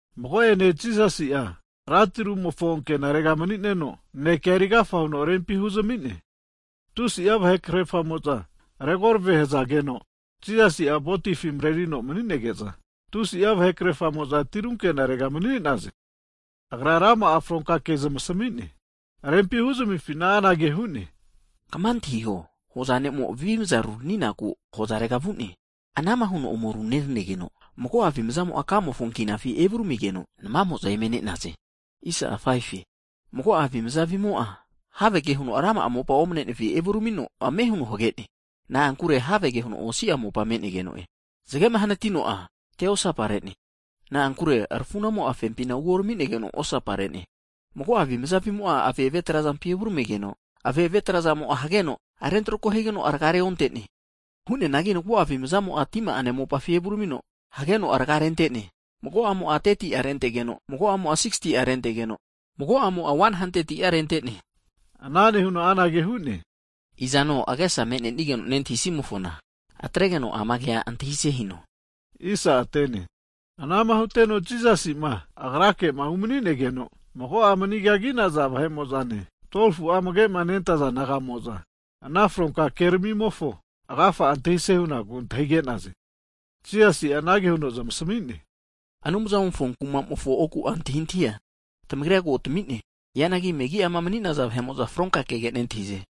Mago'ene Jisasi'a rantiru'mofo ankenare mani'neno naneke erigafa huno rempi huzami'ne. Ana nehige'za tusi'a vahe krerfamo'za regorave hazageno, Jisasi'a votifi marerino mani'nege'za, tusi'a vahe krerfamo'za tiru ankenarega mani'naze. Ana nehuno agra rama'a fronka ke zamasami'ne. Rempima huzamifina, anage hu'ne, Kama antahiho! Hoza ne'mo avimaza ruraniku hozarega vu'ne. Ana'ma huno ome runeranigeno, mago'a avimzamo'a kamofo ankinafi evuramigeno, namamo'za eme ne'naze. Mago'a avimaza avimo'a havege huno rama'a mopa omanenefi evuramiteno ame huno hagene. Na'ankure havege huno osia mopa me'negeno'e. Hagi zagemo'a hanatino teosaparene, na'ankure rafu'namo'a fempina uorami'negeno osapare'ne. Mago'a avimaza avimo'a ave'ave trazampi evuramigeno, aveave trazamo'a hageno, rentrako higeno raga'a reonte'ne. Hu'neanagi mago'a avimzamo'a tima'ane mopafi evuramiteno hageno raga'a rente'ne. Mago'amo'a 30'a rentegeno, mago'amo'a 60'a rentegeno, mago'amo'a 100'a rente'ne. Ana nehuno anage hu'ne, Izano agesa me'nenigeno nentahisimofona, atregeno ama kea antahise hino. Hagi anama huteno Jisasi'ma Agrake'ma umani'nege'za, mago'a manigagi'naza vahe'mo'zane, 12fu'a amage'ma nentaza disaipol naga'mo'za, ana fronka keramimofo agafa'a antahise hunaku antahige'naze. Jisasi'a anage huno zamasami'ne, Anumzamofo kumamofo oku'a antahintahia tamagrira ko tamine. Hianagi megi'ama mani'naza vahe'mo'za fronka kege nentahize.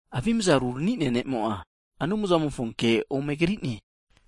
Avimaza rurani'nea ne'mo'a, Anumzamofo ke ome krine.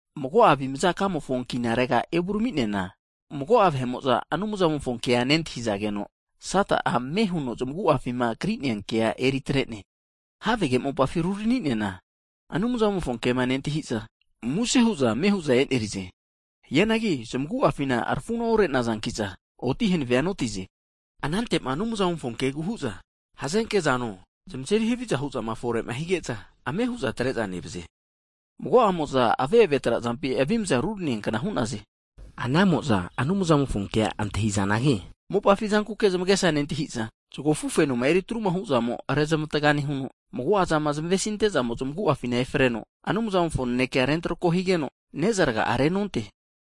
Mago'a avimazama kamofo ankinarega evurami'neana, mago'a vahe'mo'za Anumzamofo kea nentahizageno, Sata'a ame huno zamagu'afima krinea kea eritrene. Havege mopafima rurani'neana, Anumzamofo kema nentahi'za, muse hu'za ame hu'za eneri'ze. Hianagi zamagu'afina rafuna ore'neza oti hanave oti'nazankiza, anante'ma Anumzamofo kegu hu'za hazenke zano, zamazeri haviza huzama fore hige'za, ame hu'za atre'za nevaze. Mago'amo'za ave'ave trazampi avimaza ruranineankna hu'naze. Anamo'za Anumzamofo kea antahinazanagi, mopafi zankuke zamagesa nentahi'za, zago afu fenoma eri atruma huzamo rezmatga nehuno, mago'azama zamesinte'zamo zamagu'afina efreno Anumzamofo nanekea rentrako higeno ne'za raga'a renonte.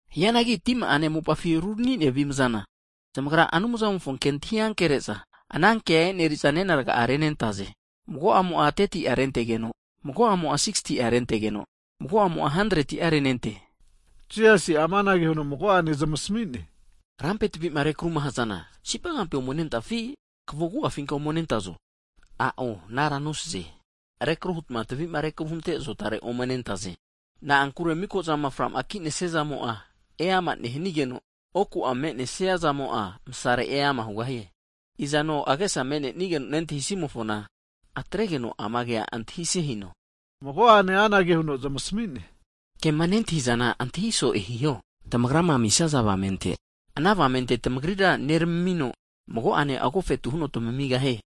Hianagi tima'ane mopafi rurani'nea avimazana, zamagra Anumzamofo kea antahi ankere'za, ana kea e'neri'za nena raga'a renentaze. Mago'mo'a 30'a rentegeno, mago'mo'a 60'a rentegeno, mago'mo'a 100'a renente. Jisasi'a amanage huno mago'ane zamasmi'ne, Rampe tavi'ma rekruma hazana, sipagampi ome nentafi, kavo agu'afinka ome nentazo? A'o anara nosaze. Rekru hutma tavima rekru hunte azotare ome nentaze. Na'ankure miko'zama fra'ma ki'nesiazamo'a, eama nehanigeno, oku'a me'nesiazamo'a, masare eama hugahie. Izano agesa me'nenigeno nentahisimofona, atregeno ama kea antahise hino. Mago'ane anage huno zamasmi'ne, Kema nentahizana antahi so'e hiho. Tamagrama amisaza avamente, ana avamente tamagrira neramamino, mago'ane agofetu huno tamamigahie.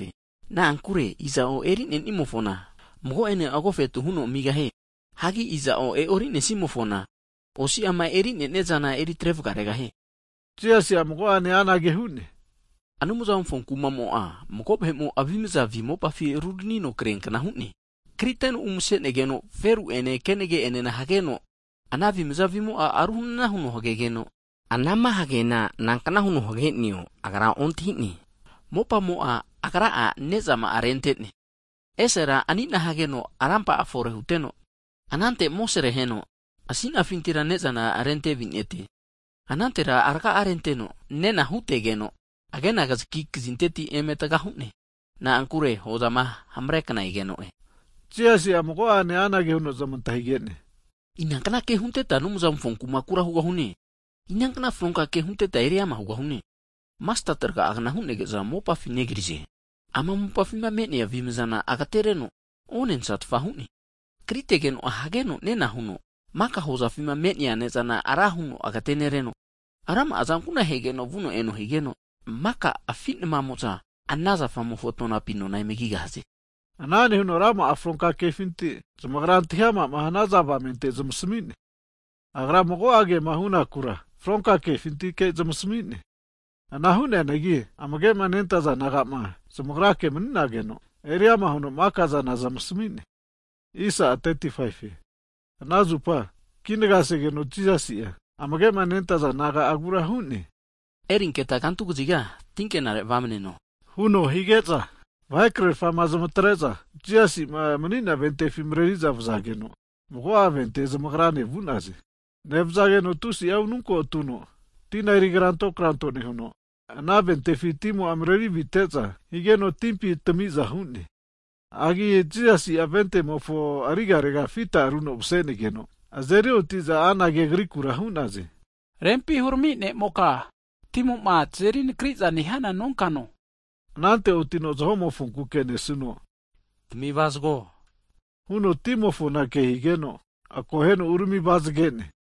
Na'ankure iza'o eri'nenimofona mago'ene agofetu huno amigahie. Hagi iza'o e'orinesimofona, osiama eri'nenia zana eritre vagaregahie. Hagi Jisasi'a mago'ane anage hu'ne, Anumzamofo kumamo'a, mago vahe'mo avimza avi mopafi ruranino kriankna hu'ne. Kriteno umasenegeno feru ene kenage'enena hageno, ana avimza avimo'a ru hanana huno hagegeno, anama hageana nankna huno hage'neo agra ontahine. Mopamo'a agra'a azerinena higeno ne'zama'a rente'ne, esera asina reno rampa'a fore huteno, anante amosare aheno, ramparera ne'zana rente avinete. Anantera raga'a renteno nena hutegeno, agena kazaki kazinteti eme taga hu'ne. Na'ankure hozama hamarekna egeno'e. Hagi Jisasi'a mago'ane anage huno zamantahige'ne, Inankna ke hunteta Anumzamofo kumakura hugahune. Inankna fronka ke hunteta eriama hugahune? Masteti raga'agna hunege'za mopafi negrize, ama mopafima me'nea avimzana agatereno onensatfa hu'ne. Hagi kritageno'a hageno nena huno, maka hozafima me'nea ne'zana ra huno agetenereno, rama'a azankuna'a hageno vuno eno higeno, maka afi' namamo'za ana zafamofo tonapi nona eme kigahaze. Ana nehuno rama'a fronka kefinti zamagrama antahi ama' hanaza avamente zamasami'ne. Agra mago'a kema hunakura fronka kefintike zamasmi'ne. Ana hu'neanagi amage'ma nentaza disaipol nagamo'zama zamagrake'ma mani'nageno, eriama huno maka'zana zamasami'ne. Hagi ananzupa kinagasegeno Jisasi'a amage nentaza disaipol naga'agura anage hu'ne, Erinketa kantu kaziga tinkenare vamneno huno hige'za, vahe krerfa zamatrete'za Jisasi'ma mani'nea votifi mareri'za vazageno, mago'a ventea zamagrane vu'naze. Nevazageno tusi'a ununko atuno, tina erikranto kranto nehuno, ana votifi timo'a marevite'za higeno, timpi votimo'a tami'za hu'ne. Hagi Jisasi'a votimofona arigarega fita runo mase'negeza, azeri oti'za anage Agrikura hu'naze. Rempi hurami ne'moka, timo'ma tazeri nakri'za nehiana nonkano? Anante otino zaho'mofona kesuno, Tami avazago huno timofona higeno, akoheno urami avazagene.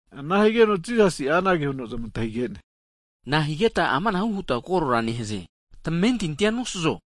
Ana higeno Jisasi'a anage huno zmantahige'ne, Nahigetma amanahu huta koro nehaze? Tamentintia nosazo?